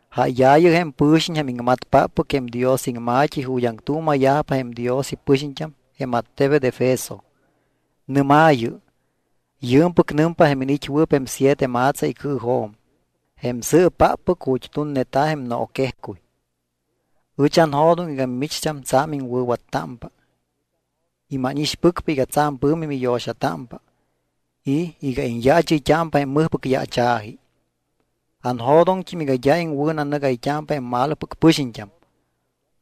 ’Jáyaayɨ jém pɨ̱xiñ jém iŋmatpáppɨc jém Dios iŋma̱t́i ju̱t́ aŋtuuma̱yajpa jém Dios ipɨxiñt́am jém attebet Efeso. Nɨ́maayɨ: “Yɨɨmpɨc nɨmpa jém iniit́wɨɨp jém siete ma̱tsa icɨɨjo̱m, jém sɨɨpáppɨc ju̱t́ tunneta̱ jém nooquejcuy: Ɨch anjo̱doŋ iga mimicht́am tsa̱m iŋwɨ̱wattámpa y mánixpɨcpa iga tsa̱m pɨ̱mi miyo̱xatámpa y iga iñyaachɨyt́ámpa jém mɨjpɨc yaacha̱ji. Anjo̱doŋt́im iga d́a iŋwɨ̱nanɨgayt́ámpa jém malopɨc pɨxiñt́am.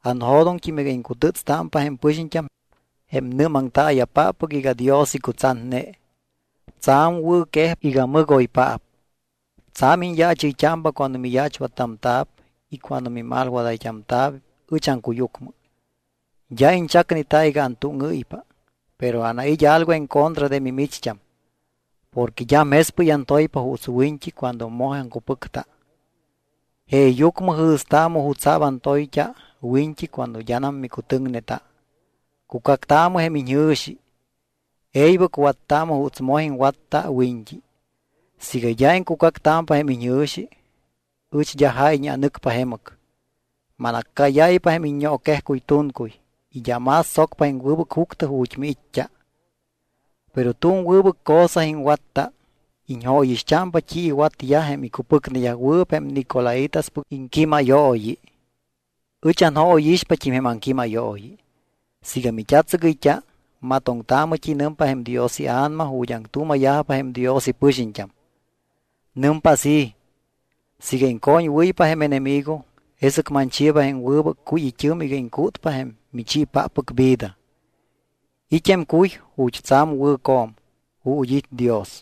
Anjo̱doŋt́im iga iŋcutɨ́tstámpa jém pɨxiñt́am jém nɨ́maŋtaaya̱páppɨc iga Dios icutsatne. Tsa̱m wɨ̱quejpa iga mɨgoypaap. Tsa̱m iñyaachɨyt́ámpa cuando miyaachwattamta̱p y cuando mimalwadayt́amta̱p ɨch aŋcuyucmɨ. D́a iñchacneta iga antúŋɨ́ypa. Pero anait́ algo en contra de mimicht́am. Porque d́am jespɨy antoypa juuts wiñt́i cuando moj aŋcupɨcta. Jeeyucmɨ jɨ̱staamɨ jutsa̱p antoyt́a wiñt́i cuando d́anam micutɨŋneta. Cucactaamɨ jém iñjɨ̱xi. E̱ybɨc wattaamɨ juuts moj iŋwatta wiñt́i. Siiga d́a iŋcucactámpa jém iñjɨ̱xi, ɨch d́a jáyñe anɨcpa jemɨc, manaccáyáypa jém iññooquejcuy tuncuy y d́a más tsocpa jém wɨbɨc juctɨ ju̱t́ miit́t́a. Pero tu̱m wɨbɨc cosa iŋwatta. Iñjóyixt́ámpa t́i iwatyajpa jém icupɨcneyajwɨɨp jém nicolaítaspɨc iŋquímayooyi. Ɨch anjóyixpat́im jém aŋquímayooyi. Siiga mit́atsɨgɨyt́a, matoŋtaamɨ t́i nɨmpa jém Dios iA̱nama ju̱t́ aŋtuuma̱yajpa jém Dios ipɨxiñt́am. Nɨmpa así: Siiga iŋcoñwɨ́ypa jém enemigo, jesɨc manchiiba jém wɨbɨc cuy it́ɨm iga iŋcútpa jém michiipáppɨc vida. It́ jém cuy ju̱t́ tsa̱m wɨ̱co̱m ju̱t́ it́ Dios.”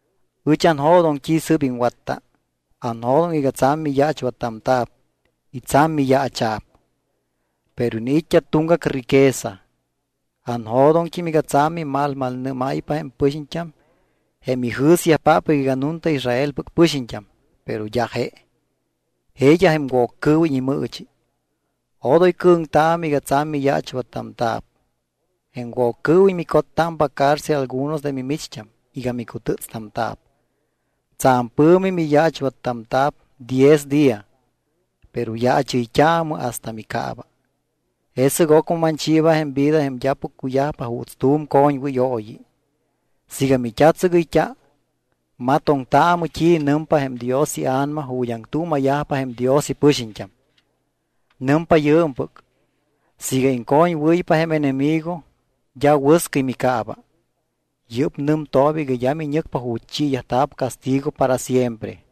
Ɨch anjo̱doŋ t́i sɨ́p iŋwatta. Anjo̱doŋ iga tsa̱m miyaachwattamta̱p y tsa̱m miyaacha̱p, pero iniit́t́a tuŋgac riqueza. Anjo̱doŋt́im iga tsa̱m mimalmalnɨ́máypa jém pɨxiñt́am jém ijɨ̱syajpáppɨc iga nunta Israelpɨc pɨxiñt́am, pero d́a je. Jeeyaj jém Woccɨɨwiñ imɨɨchi. Odoy cɨ̱ŋtaamɨ iga tsa̱m miyaachwattamta̱p. Jém Woccɨɨwiñ micottámpa cárcel algunos de mimicht́am iga micutɨ́tstamta̱p. Tsa̱m pɨ̱mi miyaachwattamta̱p diez día. Pero yaachɨyt́aamɨ hasta micaaba, jesɨc ocmɨ manchiiba jém vida jém d́apɨc cuyajpa juuts tu̱m coñwɨyooyi. Siiga mit́atsɨgɨyt́a, matoŋtaamɨ t́i nɨmpa jém Dios iA̱nama ju̱t́ aŋtuuma̱yajpa jém Dios ipɨxiñt́am. Nɨmpa yɨɨmpɨc: Siiga iŋcoñwɨ́ypa jém enemigo d́a wɨscɨy micaaba. Yɨ́p nɨmtooba iga d́a miñɨcpa ju̱t́ chiiyajta̱p castigo para siempre.”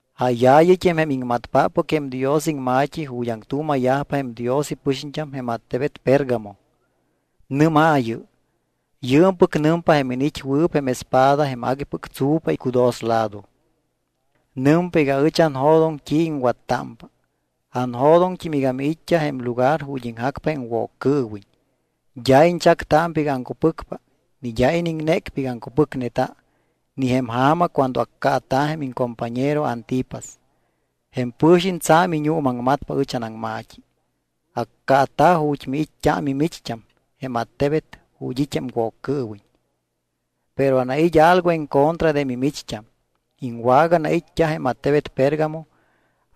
’Jáyaayɨt́im jém iŋmatpáppɨc jém Dios iŋma̱t́i ju̱t́ aŋtuuma̱yajpa jém Dios ipɨxiñt́am jém attebet Pérgamo. Nɨ́maayɨ: “Yɨɨmpɨc nɨmpa jém iniit́wɨɨp jém espada jém aguipɨc tsu̱pa icudoslado. Nɨmpa iga ɨch anjo̱doŋ t́i iŋwattámpa. Anjo̱doŋt́im iga miit́t́a jém lugar ju̱t́ iŋjacpa jém Woccɨɨwiñ. D́a iñchactámpa iga aŋcupɨcpa ni d́a iniŋnécpa iga aŋcupɨcneta ni jém ja̱ma cuando accaata̱ jém iŋcompañero Antipas. Jém pɨ̱xiñ tsa̱m iñuumaŋmatpa ɨch anaŋma̱t́i. Accaata̱ ju̱t́ miit́t́a mimicht́am jém attebet ju̱t́ it́ jém Woccɨɨwiñ. Pero anait́ algo en contra de mimicht́am. Iŋwaganait́t́a jém attebet Pérgamo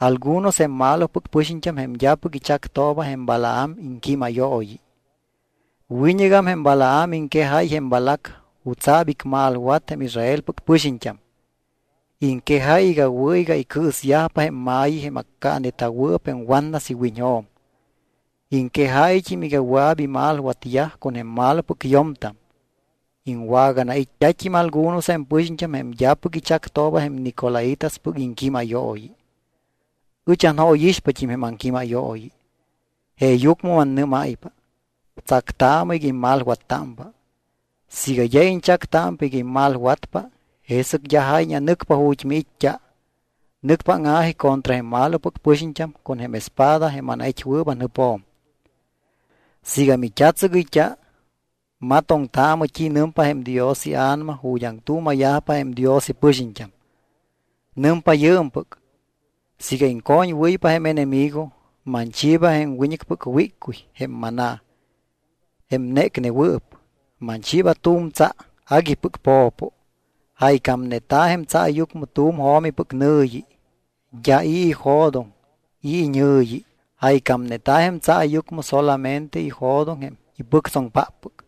algunos jém malopɨc pɨxiñt́am jém d́apɨc ichactooba jém Balaam iŋquímayooyi. Wiñɨgam jém Balaam iŋquejáy jém Balac jutsa̱p icmalwat jém Israelpɨc pɨxiñt́am. Iŋquejáy iga wɨ̱ iga icɨɨsyajpa jém ma̱yi jém accaaneta̱wɨɨp jém watnas iwiñjo̱m. Iŋquejáyt́im iga wɨa̱p imalwatyaj con jém malopɨc yo̱mtam. Iŋwaganait́t́at́im algunos jém pɨxiñt́am jém d́apɨc ichactooba jém nicolaítaspɨc iŋquímayooyi. Ɨch anjóyixpat́im jém aŋquímayooyi. Jeeyucmɨ mannɨ́máypa: Tsactaamɨ iga immalwattámpa. Siiga d́a iñchactámpa iga immalwatpa jesɨc d́a jáyñe anɨcpa ju̱t́ miit́t́a. Nɨcpa áŋa̱ji contra jém malopɨc pɨxiñt́am con jém espada jém anait́wɨɨp anjɨpjo̱m. Siiga mit́atsɨgɨyt́a, matoŋtaamɨ t́i nɨmpa jém Dios iA̱nama ju̱t́ aŋtuuma̱yajpa jém Dios ipɨxiñt́am. Nɨmpa yɨɨmpɨc: Siiga iŋcoñwɨ́ypa jém enemigo, manchiiba jém wiñɨcpɨc wíccuy, jém maná, jém nécnewɨɨp. Manchiiba tu̱m tsa aguipɨc po̱po. Jaycámayñeta̱ jém tsaayucmɨ tu̱m jo̱mipɨc nɨ̱yi. D́a i̱ ijo̱doŋ i̱ iñɨ̱yi jaycámayñeta̱ jém tsaayucmɨ solamente ijo̱doŋ jém ipɨctsoŋpáppɨc.”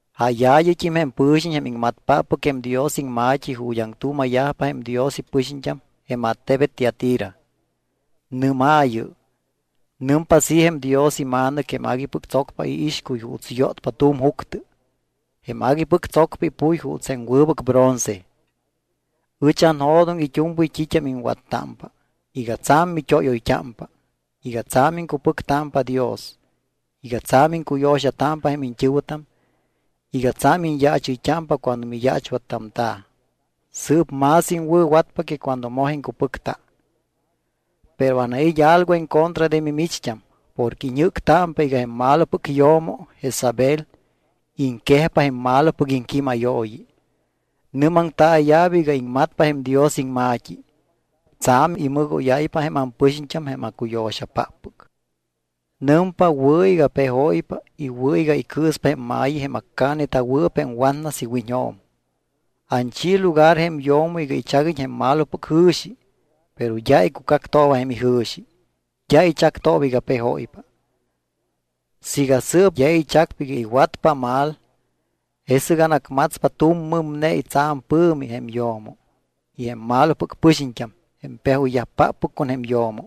’Jáyaayɨt́im jém pɨ̱xiñ jém iŋmatpáppɨc jém Dios iŋma̱t́i ju̱t́ aŋtuuma̱yajpa jém Dios ipɨxiñt́am jém attebet Tiatira. Nɨ́maayɨ: “Nɨmpa así jém Dios iMa̱nɨc jém aguipɨc tsocpa iixcuy juuts yótpa tu̱m juctɨ, jém aguipɨc tsocpa ipuy juuts jém wɨbɨc bronce: Ɨch anjo̱doŋ it́u̱mpɨy t́it́am iŋwattámpa, iga tsa̱m mit́óyoyt́ámpa, iga tsa̱m iŋcupɨctámpa Dios, iga tsa̱m iŋcuyo̱xatámpa jém iñt́ɨ̱wɨtam, iga tsa̱m iñyaachɨyt́ámpa cuando miyaachwattamta̱. Sɨɨp más iŋwɨ̱watpa que cuando moj iŋcupɨcta. Pero anait́ algo en contra de mimicht́am porque iñjɨ́ctámpa iga jém malopɨc yo̱mo, Jezabel, iŋquejpa jém malopɨc iŋquímayooyi. Nɨ́maŋtaaya̱p iga iŋmatpa jém Dios iŋma̱t́i. Tsa̱m imɨgóyáypa jém ampɨxiñt́am jém acuyo̱xapáppɨc. Nɨmpa wɨ̱ iga pejóypa y wɨ̱ iga icɨɨspa jém ma̱yi jém accaaneta̱wɨɨp jém watnas iwiñjo̱m. Anchi lugar jém yo̱mo iga ichaguiñ jém malopɨc jɨ̱xi, pero d́a icucactooba jém ijɨ̱xi. D́a ichactooba iga pejóypa. Siiga sɨɨp d́a ichacpa iga iwatpa mal, jesɨc anacmatspa tu̱m mɨmnei tsa̱m pɨ̱mi jém yo̱mo. Y jém malopɨc pɨxiñt́am, jém pejoyyajpáppɨc con jém yo̱mo,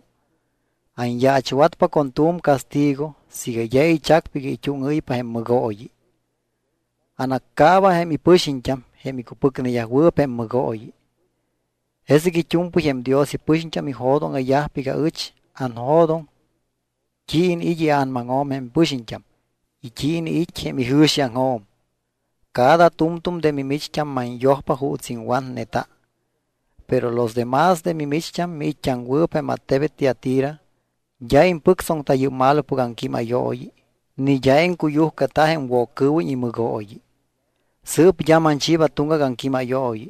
anyaachwatpa con tu̱m castigo siiga d́a ichacpa iga it́úŋɨ́ypa jém mɨgooyi. Anaccaaba jém ipɨxiñt́am jém icupɨcneyajwɨɨp jém mɨgooyi. Jesɨc it́u̱mpɨy jém Dios ipɨxiñt́am ijo̱dóŋa̱yajpa iga ɨch anjo̱doŋ t́i iniit́ ia̱namaŋjo̱m jém pɨxiñt́am y t́i iniit́ jém ijɨ̱xiaŋjo̱m. Cada tu̱mtu̱m de mimicht́am manyojpa juuts iŋwatneta. Pero los de más de mimicht́am miit́t́aŋwɨɨp jém attebet Tiatira, d́a impɨctsoŋta yɨ́p malopɨc aŋquímayooyi ni d́a iŋcuyujcata jém Woccɨɨwiñ imɨgooyi. Sɨɨp d́a manchiiba tuŋgac aŋquímayooyi.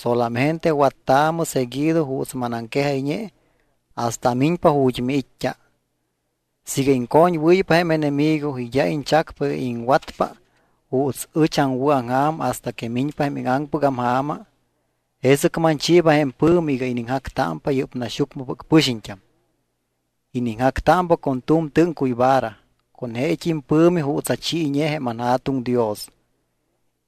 Solamente wattaamɨ seguido juuts manaŋquejayñe hasta amiñpa ju̱t́ miit́t́a. Siiga iŋcoñwɨ́ypa jém enemigo y d́a iñchacpa iga iŋwatpa juuts ɨch aŋwɨ̱aŋja̱m hasta que miñpa jém íŋaŋpɨgam ja̱ma, jesɨc manchiiba jém pɨ̱mi iga iniŋjactámpa yɨ́p naxyucmɨpɨc pɨxiñt́am. Iniŋjactámpa con tu̱m tɨ́ŋcuy vara con jeet́im pɨ̱mi juuts achiiñe jém anJa̱tuŋ Dios.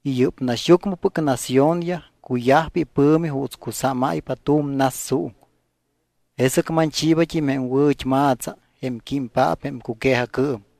Y yɨ́p naxyucmɨpɨc naciónyaj cuyajpa ipɨ̱mi juuts cusámáypa tu̱m nas suuŋ. Jesɨc manchiibat́im jém wɨ̱t́ma̱tsa jém químpaap jém cuque̱jacɨɨm.